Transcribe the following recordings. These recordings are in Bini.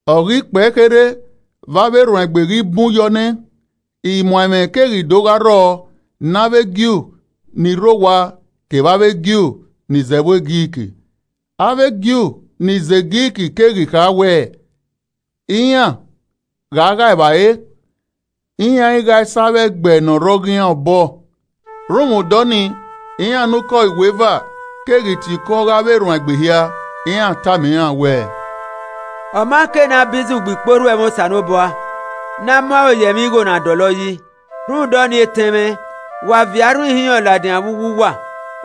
Ọ ghi kpẹe kherhe, vbe avbe erhuanegbe ghi bun yọ nẹ, imuaẹmwẹ keghi do gha rrọọ ne avbe Ju ni rre owa kevbe avbe Ju ni zẹ ẹvbo Grik. Avbe Ju ni zẹ Grik keghi kha wẹ iran gha ghae evbare, iran i ghae sẹ avbe ẹgbẹe ni re ọghe iran vbọ obọ. Rhunmwuda ọnii, iran ne ukọ iweva keghi tie iko ọghe avbe erhuanegbe hia, iran tama iran wẹẹ, “Ọ ma ke ne a bizu gbe ikporhu ẹmwẹ Osanobua ne a mu aro ye ẹmwẹ igho na dọlọ yi. Rhunmwuda ọnii, etẹn mwẹ, wa viọ arhin ihinrọn ladian vbe uwu uwa,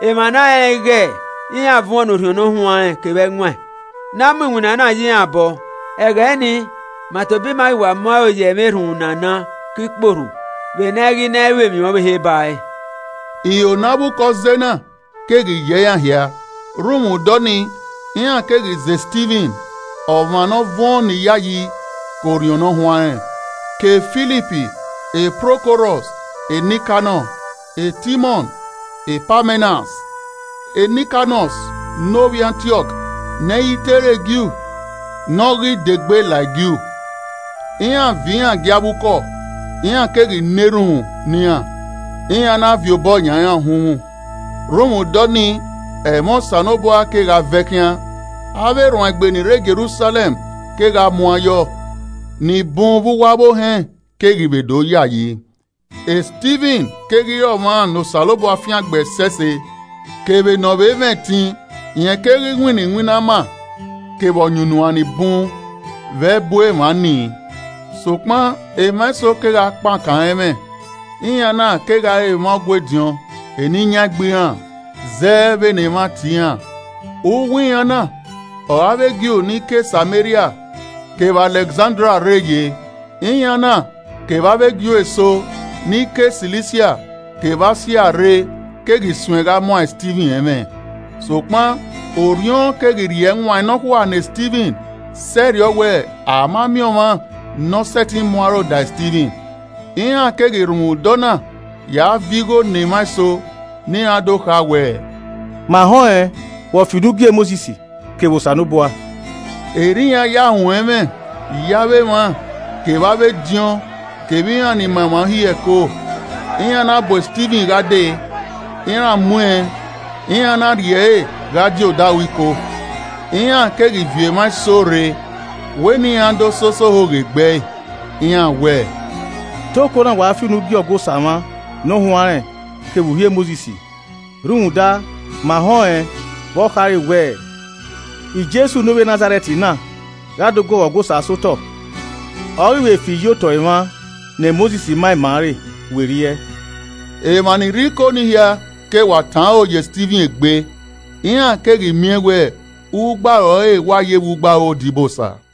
emwa n a rẹnrẹn ighe iran vuọn ne Orhiọn Ne Ọ Huanrẹn kevbe ẹwaẹn, ne a mu iwinna na ye iran obọ. Ẹghẹ nii, ma tobọ ima ghi wa mu aro ye ẹmwẹ erhunmwu ne a ka ke ikporhu, vbe ne a i ghi na ru emwi ọvbehe ba ẹre.” Iro ne avbe ukọ zẹe na keghi yẹ iran hia, rhunmwuda ọnii, iran keghi zẹ Stivin, ọmwa ne ọ vuọn ne Iyayi ke Orhiọn Ne Ọ Huanrẹn, ke Filip, Prokorọs, Nikanọ, Timọn, Pamenas, Nikolas ne ovbi Antiọk, ne ẹ i te re Ju ne ọ ghi degbe la e Ju. Iran viọ iran gie avbe ukọ, iran keghi na erhunmwu ne iran, iran na viọ obọ yan iran uhunmwu. Rhunmwuda ọnii, ẹmwẹ Osanobua kegha vẹ khian. Avbe erhuanegbe ni rre Jerusalẹm kegha muan yọ, nibun vbe uwu avbe ohẹn keghi vbe do yayi. E Stivin keghi re ọmwa ne Osanobua fiangbe ẹsẹse kevbe ne ọ vbe mwẹ ẹtin, rẹn keghi winna iwinna ama, kevbe ọyunnuan ni bun vbe ẹbu emwa nii. Sokpan emwa eso kegha kpankan ẹre ẹmwẹ, iran na kegha re emwa Ọgua ediọn Eniyan Egbe iran (zẹ vbene emwa tie iran) uwu iran na ọre avbe Ju ni ke Sameria kevbe Alẹkzandria rre ye. Iran na kevbe avbe Ju eso ni ke Silisia kevbe Asia rre keghi suẹn gha muan Stivin ẹmwẹ. Sokpan Orhiọn keghi rhie ẹwaẹn nọkhua ne Stivin, sẹrriọ wẹ, a ma miẹn ọmwa ne ọ sẹtin mu aro da Stivin. Iran keghi rhunmwuda ọna ya viọ igho ne emwa eso, ne iran do kha wẹẹ, “Ma họn ẹn vbe ọ fi unu gie Mosis kevbe Osanobua.” Erriọ iran ya ruẹn ẹmwẹ ye avbe emwa kevbe avbe ediọn kevbe iran ni ma emwa Uhi ẹko. Iran na bu Stivin gha dee, iran mu ẹn, iran na rhie ẹre gha die odaro Iko. Iran keghi viọ emwa eso rre wẹ ne iran do sẹ osẹe ohoghe gbe ẹe. Iran wẹẹ, “Te okona wa fi unu gie Ọgua Osa mwa ne ọ huanrẹn kevbe uhi Mosis. Rhunmwuda, ma họn ẹn vbe ọ khare wẹẹ, Jesu ne Ovbi e Nazarẹt na, gha do guọghọ Ọgua Osa sẹ otọ, ọ ghi vbe fi iyi otọe mwa ne Mosis ma ima re werriẹ.” Emwa ni rre Iko ni hia ke wa tọn aro ye Stivin egbe, iran keghi miẹn wẹ, ugbaro ẹre wa yevbe ugbaro odibosa.